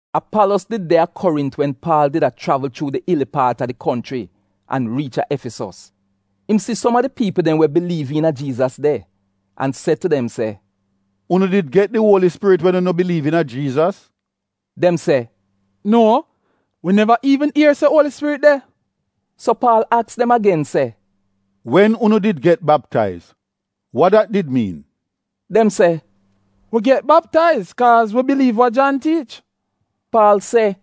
Apalos did de a Korint wen Paal did a chravl chuu di ili paat a di konchri an riich a Efisos. Im si som a di piipl dem we biliiv iina Jiizas de, an se tu dem se, “Unu did get di Uoli Spirit wen unu biliiv iina Jiizas?” Dem se, “Nuo, wi neva iivn ier se Uoli Spirit de.” So Paal aks dem agen se, “Wen unu did get baptaiz, wa dat did miin?” Dem se, “Wi get baptaiz kaaz wi biliiv wa Jan tiich.” Paal se,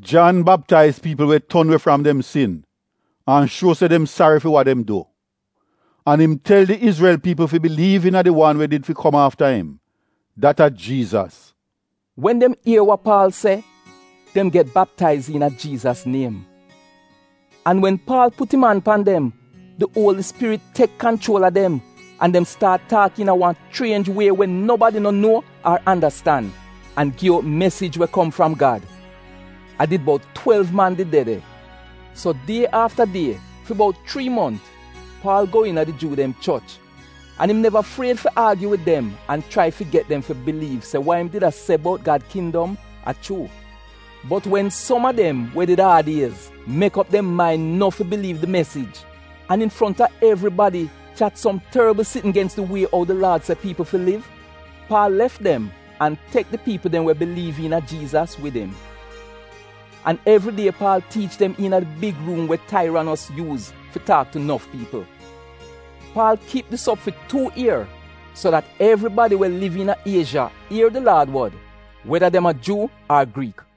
“Jan baptaiz piipl we ton we fram dem sin an shuo se dem sari fi wa dem du. An im tel de Izrel piipl fi biliiv iina di wan we did fi kom afta im, dat a Jiizas.” Wen dem ier wa Paal se, dem get baptaiz iina Jiizas niem. An wen Paal put im an pan dem, di Uoli Spirit tek kanchuol a dem, an dem staat taak iina wan chrienj wie we nobadi no nuo ar andastan, an gi out mesij we kom fram Gad. A did bout twelv man did de de. So die afta die, fi bout chrii mont, Paal go iina di Juu dem choch an im neva fried fi aagyu wid dem an an chrai fi get dem fi biliiv se wa im did a se bout Gad kindom a chuu. Bot wen som a dem we did aad iez mek op dem main no fi biliiv di mesij, an infronta evribadi, chat som torbl sitn gens di Wie ou di Laad se piipl fi liv, Paal lef dem an tek di piipl dem we biliiv iina Jiizas wid im. An evri die Paal tiich dem iina di big ruum we Tairanos yuuz fi taak tu nof piipl. Paal kip dis op fi tuu ier, so dat evribadi we liv iina Iezha ier di Laad wod, weda dem a Juu ar Griik.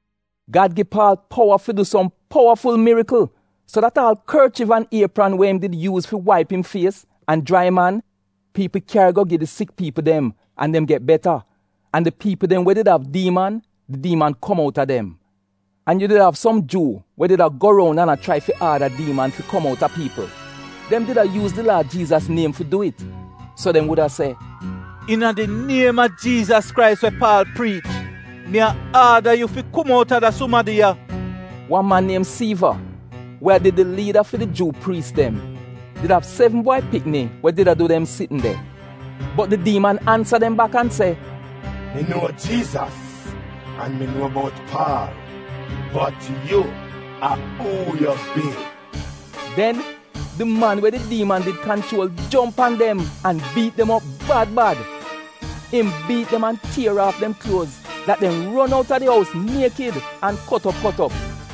Gad gi Paal powa fi du som powaful mirikl so dat aal korchiv an iepran we im did yuuz fi waip im fies an jrai im an, piipl kyari go gi di sik piipl dem an dem get beta, an di piipl dem we did av diiman — di diiman kom outa dem. An yu did av som Juu we did a go roun an a chrai fi aada diiman fi kom outa piipl. Dem did a yuuz di Laad Jiizas niem fi du it, so dem wuda se, “Iina di niem a Jiizas Krais we Paal priich, mi a aada yu fi kom outa da sumadi ya.” Wan man niem Siiva, we a did di liida fi di Juu priis dem did av sevn bwai pikni we did a du dem sitn de. Bot di diiman ansa dem bak an se, “Mi nuo Jiizas, an mi nuo bout Paal. Bot yu, a uu yu bi?” Den di man we di diiman did kanchuol jomp pan dem an biit dem op riil bad. Im biit dem an tier aaf dem kluoz dat dem ron outa di ous niekid an kot op kot op.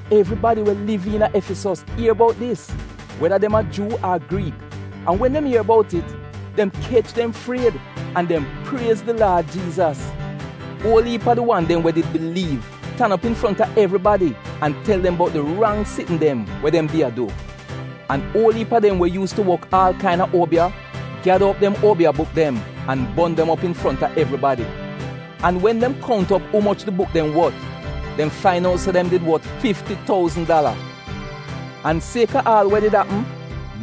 Evribadi we liv iina Efisos ier bout dis, weda dem a Juu ar Griik an wen dem ier bout it, dem kech dem fried, an dem priez di Laad Jiizas. Uol iip a di wan dem we did biliiv tan op infronta evribadi an tel dem bout di rang sitn dem we dem did a du. An uol iip a dem we yuus tu wok aal kaina uobiya gyada op dem uobiya buk dem an bon dem op infronta evribadi. An wen dem kount op umoch di buk dem wot, dem fain out se dem did wot fifti touzn dala. An sieka aal wa did apm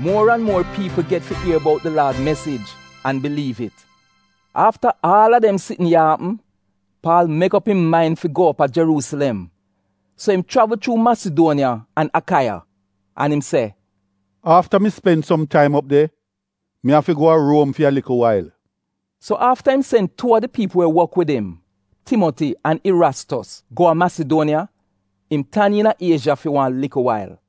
muor an muor piipl get fi ier bout di Laad mesij an biliiv it. Afta aal a dem sitn ya apm, Paal mek op im main fi go op a Jeruusilem, so im chravl chuu Masiduoniya an Akaiya. An im se, “Afta mi spen som taim op de, mi afi go a Ruom fi a likl wail.” So afta im sen tuu a im paadi dem, Timoti an Irastos, go a Masiduoniya, im tan iina Iezha fi wan likl wail.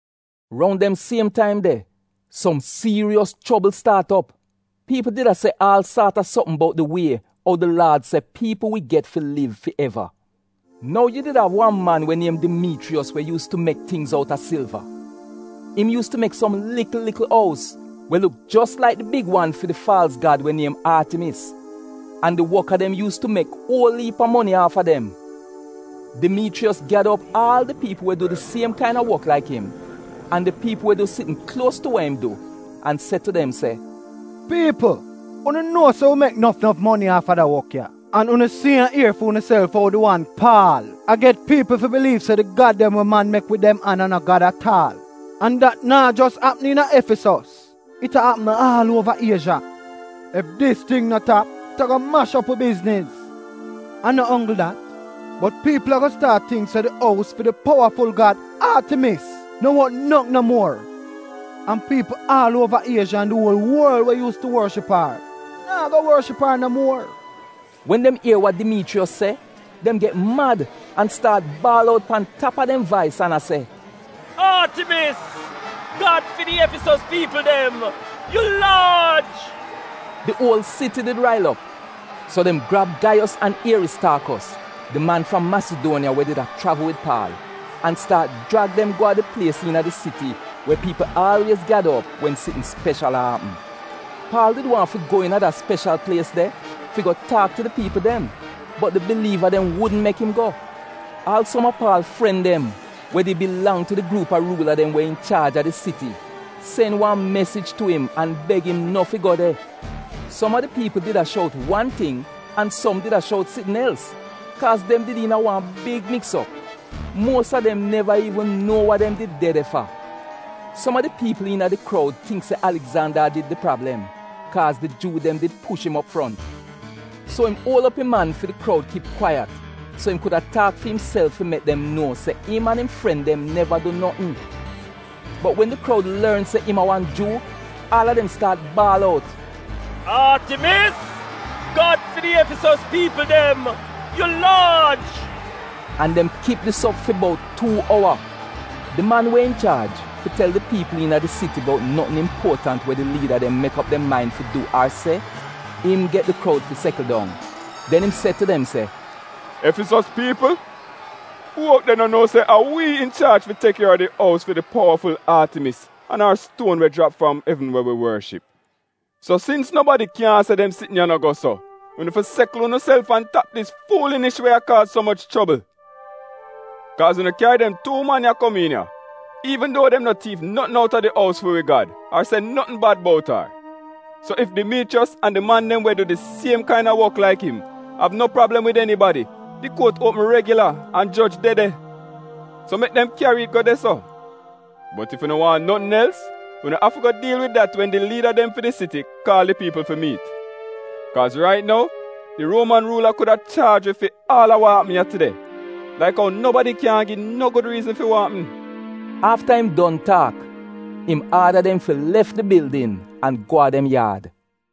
Roun dem siem taim de, som siiriyos chobl staat op. Piipl did a se aal saat a sopm bout di Wie ou di Laad se piipl wi get fi liv fi eva. Nou yu did av wan man we niem Dimiichriyos we yuus tu mek tingz outa silva. Im yuus tu mek som likl likl ous we luk jos laik di big wan fi di faalz gad we niem Aatimis. An di woka dem yuus tu mek uol iip a moni aafa dem. Dimiichriyos gyada op aal a di piipl we du di siem kaina wok laik im an di piipl we du sitn kluos tu wa im du an se tu dem se, “Piipl, unu nuo se wi mek nof nof moni aafa da wok ya. An unu si an ier fi unuself ou di wan Paal a get piipl fi biliiv se di gad dem we man mek wid dem an a no gad at aal. An dat naa jos apm iina Efisos, it a apm aal uova Iezha. Ef dis ting no tap, it ago mash op wi bizniz. An no onggl dat, bot piipl ago staat tingk se di ous fi di powaful gad Aatimis no wot notn no muor. An piipl aal uova Iezha an di uol worl we yuus tu worship ar, naa go worship ar no muor.” Wen dem ier wa Dimiichriyos se dem get mad an staat baal out pan tap a dem vais an a se, “Aatimis, gad fi di Efisos piipl dem, yu laaj!” Di uol siti did rail op. So dem grab Gaiyos an Ieristaakos, di man fram Masiduoniya we did a chravl wid Paal, an staat jrag dem go a di plies iina di siti we piipl aalwiez gyada op wen sitn speshal a apm. Paal did waahn fi go iina da speshal plies fi go taak tu di piipl dem, bot di biliiva dem wudn mek im go. Aal som a Paal fren dem we di bilang tu di gruup a ruula dem we inchaaj a di siti sen wan mesij tu im an beg im no fi go de. Som a di piipl did a shout wan ting an som did a shout sitn els, kaaz dem did iina wan big miks op. Muos a dem neva iivn nuo wa dem did de de fa. Som a di piipl iina di kroud tingk se Aligzanda a did di prablem, kaaz di Juu dem did push im op front. So im uol op im an fi di kroud kip kwaiyat so im kuda taak fi imself fi mek dem nuo se im an im paadi neva du notn. Bot wen di kroud lorn se im a wan Juu, aal a dem staat baal out “Aatimis, gad fi di Efisos piipl dem, yu laaj!” An dem kip dis op fi bout tuu owa. Di man we inchaaj fi tel di piipl iina di siti bout notn impuotant we di liida dem mek op dem main fi du ar se, im get di kroud fi sekl dong. Den im se tu dem se, “Efisos piipl, uu out de no nuo se a wi inchaaj fi tek kier a di ous fi di powaful Aatimis an ar stuon we jrap fram evn we wi worship? So sins nobadi kyaahn se dem sitn ya no go so, unu fi sekl unuself an tap dis fuulinish we a kaaz so moch chobl. Kaaz unu kyari dem tuu man ya komiin ya iivn duo dem no tiif notn outa di ous fi wi gad, ar se notn bad bout ar. So ef Dimiichriyos an di man dem we du di siem kaina wok laik im av no prablem wid enibadi, di kuot uopm regila an joj de de. So mek dem kyari it go de-so. Bot ef unu waahn notn els, unu afi go diil wid dat wen di liida dem fi di siti kaal di piipl fi miit. Kaaz rait nou di Ruoman ruula kuda chaaj wi fi aal a wa apm ya tide laik ou nobadi kyaahn gi no gud riizn fi wa apm.” Afta im don taak, im aada dem fi lef di bildin an go a dem yaad.